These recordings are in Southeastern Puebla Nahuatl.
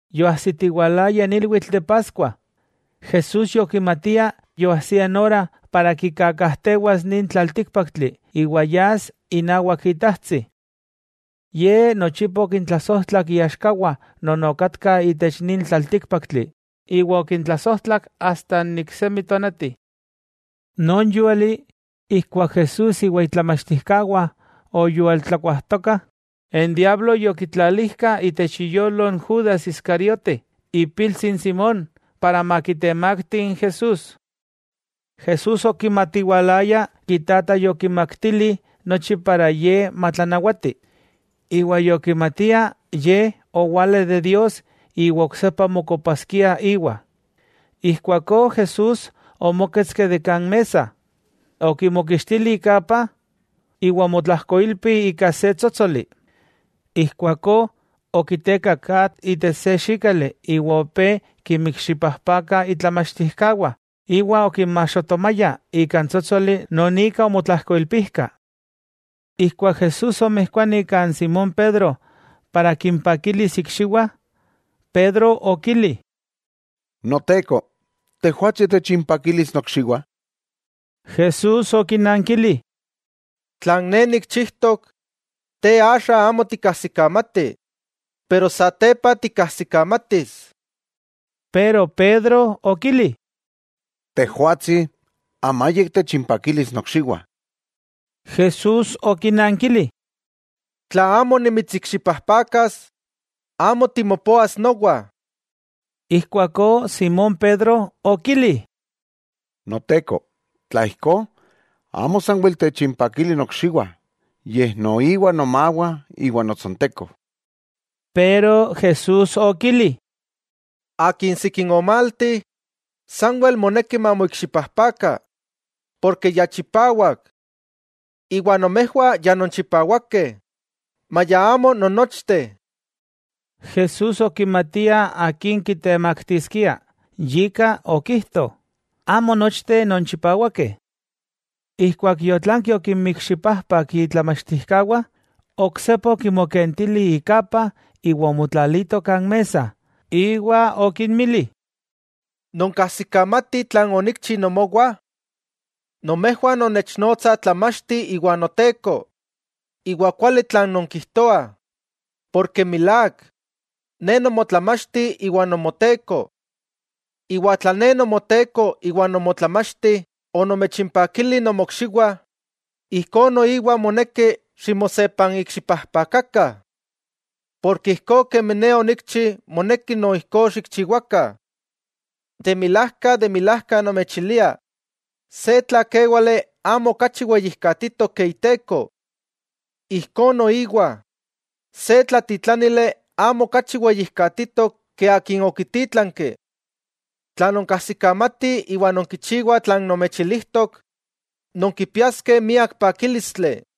Yoajsitiwalaya n ilwitl de Paskua, Jesús yokimatia yoajsia n ora para kikakajtewas nin tlaltíkpaktli iwa yas inawak Itajtsi. Ye nochipa okintlasojtlak iaxkawah non okatkah itech nin tlaltíkpaktli, iwa okintlasojtlak asta n iksemi tonati. Non yúali, ijkuak Jesús iwa itlamachtijkawah oyualtlakuajtokah, n diablo yokitlalijka itech iyolo n Judas Iscariote, ipiltsi n Simón, para makitemakti n Jesús. Jesús okimatiwalaya Itata yokimaktili nochi para Ye matlanawati, iwa yokimatia Ye owala de Dios iwa oksepa mokopaskia íwa. Ijkuakó Jesús omóketski de kan mesa, okimokixtili ikapa, iwa omotlajkoilpi ika se tsótsoli. Ijkuakó okitekak atl itech se xíkali iwa opé kinmikxipajpaka itlamachtijkawah iwa okinmaxotomaya ika n tsótsoli non ika omotlajkoilpijka. Ijkuak Jesús omijkuani kan Simón Pedro para kimpakilis ikxiwah, Pedro okili: —Noteko, ¿Tejwatsi, techimpakilis nokxiwah? Jesús okinankili: —Tlan Ne nikchijtok, te axa amo tikajsikamati, pero satepa tikajsikamatis. Pedro okili: —Tejwatsi amayik techimpakilis nokxiwah. Jesús okinankili: —Tla amo nimitsikxipajpakas, amo timopoas nowa. Ijkuakó Simón Pedro okili: —Noteko, tla ijkó, amo sanwel techimpakili nokxiwah, yej noiwa nomawah iwa notsonteko. Pero Jesús okili: —Akin sikin omalti, sanwel moneki mamoikxipajpaka, porke ya chipawak. Iwa nomejwah ya nonchipawakeh, maya amo non nochteh. Jesús okimatia akin kitemaktiskia, yika okijto: “Amo nochteh nonchipawakeh.” Ijkuak yotlanki okimikxipajpak itlamachtijkawah, oksepa okimokentili ikapa iwa omotlalito kan mesa, iwa okinmili: —¿Nonkajsikamatih tlan onikchi nomowah? Nomejwah nonnechnotsah Tlamachti iwa Noteko, iwa kuali tlan nonkijtoah, porke milák, Ne Nomotlamachti iwa Nomoteko. Iwa tla Ne Nomoteko iwa Nomotlamachti onomechinpakili nomokxiwah, ijkó noiwa moneki ximosepanikxipajpakakah. Porke ijkó kemi Ne onikchi moneki no ijkó xikchiwakah. De milajka, de milajka nomechilia se tlakéwale amo okachi weyijkatitok ke iteko. Ijkó noiwa, se tlatitlánili amo okachi weyijkatitok ke akin okitítlanki. Tla nonkajsikamatih iwa nonkichiwah tlan nomechilijtok, nonkipiaskeh miak pakílistli.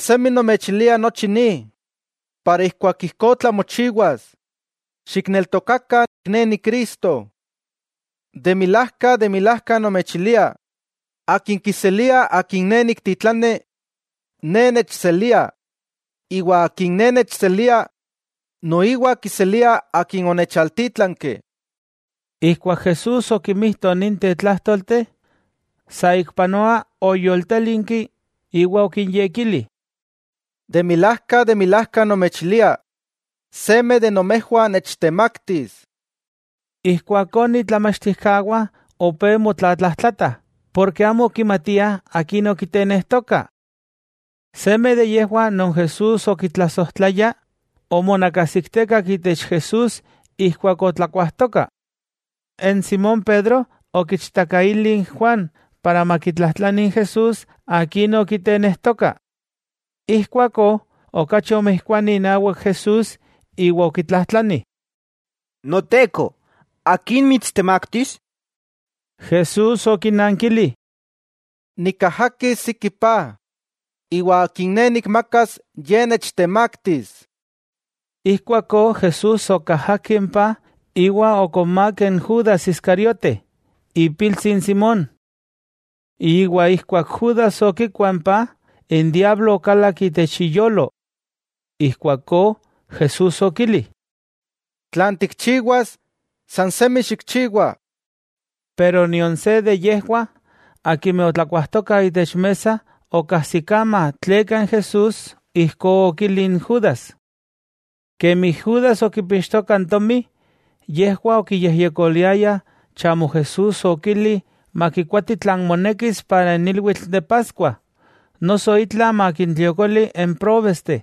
Axa nomechilia nochi ni, para ijkuak ijkó tlamochiwas, xikneltokakah Ne Ni Cristo. De milajka, de milajka nomechilia: Akin kiselia akin Ne niktitlani, Ne nechselia, iwa akin Ne nechselia, noiwa kiselia Akin onechaltítlanki. Ijkuak Jesús okimijto ninteh tlájtolteh, saikpanoa oyoltélinki iwa okinyekili: —De milajka, de milajka nomechilia, seme de nomejwah nechtemaktis. Ijkuakó n itlamachtijkawah opé motlatlajtlatah, porke amo okimatiah akin okitenejtoka. Seme de yejwah non Jesús okitlasojtlaya, omonakasiktekak itech Jesús ijkuak otlakuajtokah. Simón Pedro okichtakaili n Juan makitlajtlani n Jesús akin okitenejtoka. Ijkuakó okachi omijkuani inawak Jesús iwa okitlajtlani: —Noteko, ¿akin mitstemaktis? Jesús okinankili: —Nikajakis siki paj, iwa akin Ne nikmakas, ye nechtemaktis. Ijkuakó Jesús okajaki n paj iwa okonmák n Judas Iscariote, ipiltsi n Simón. Ijkuak Judas okikua n paj, n diablo okalak itech iyolo. Ijkuakó Jesús okili: —Tlan tikchiwas sansemi xikchiwa. Nion se de yejwah, akimeh otlakuajtokah itech mesa okajsikama tleka n Jesús ijkó okili n Judas. Kemi Judas okipixtoka n tomi, yejwah okiyejyekoliayah chamo Jesús okili makikoati tlan monekis para n ilwitl de Paskua, noso itla makintliokoli n próbesteh.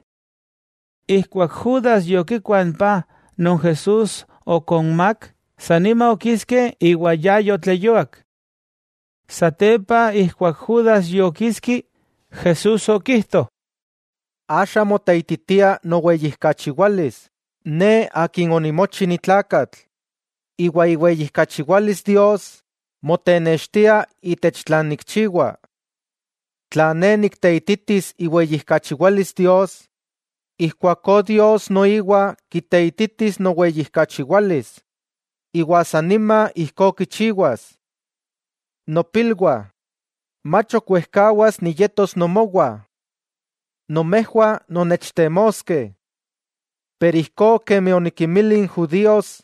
Ijkuak Judas yokikua n paj non Jesús okonmák, sanima okiski, iwa ya yotleyuak. Satepa ijkuak Judas yokiski, Jesús okijto: —Axa moteititia noweyijkachiwalis Ne Akin onimochi ni tlakatl, iwa iweyijkachiwalis Dios motenextia itech tlan Ne nikchiwa. Tla Ne nikteititis iweyijkachiwalis Dios, ijkuakó Dios noiwa kiteititis noweyijkachiwalis, iwa san nima ijkó kichiwas. Nopilwah, mach ok wejkawas niyetos nomowah. Nomejwah nonnechtemoskeh. Pero ijkó kemi onikinmili n judíos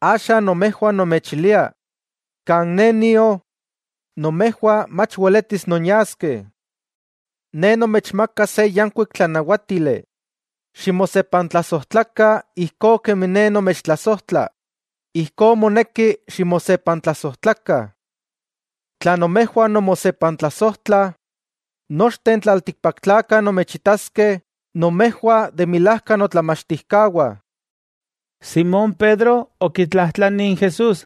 axa nomejwah nomechilia: Kan Ne nio, nomejwah mach weletis nonyaskeh. Ne nomechmaka se yankuik tlanawátili: Ximosepantlasojtlakah, ijkó kemi Ne nomechtlasojtla, ijkó moneki ximosepantlasojtlakah. Tla nomejwah nonmosepantlasojtlah, nochteh n tlaltikpaktlakah nomechitaskeh nomejwah de milajka notlamachtijkawah. Simón Pedro okitlajtlani n Jesús: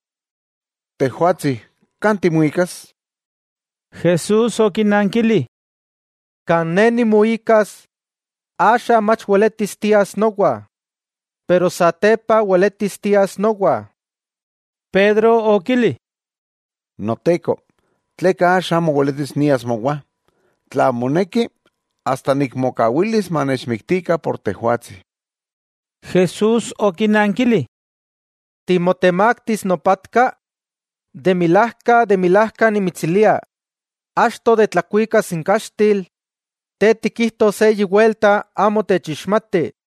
—Tejwatsi, ¿kan timuikas? Jesús okinankili: —Kan Ne nimuikas, axa mach weletis tias nowa. Pero satepa weletis tias nowa. Pedro okili: —Noteko, ¿tleka axa amo weletis nias mowa? ¡Tla moneki, asta nikmokawilis manechmiktikah por Tejwatsi! Jesús okinankili: —¿Timotemaktis nopatka? De milajka, de milajka nimitsilia, achto de tlakuikas n kaxtil, te tikijtos eyi welta amo techixmati.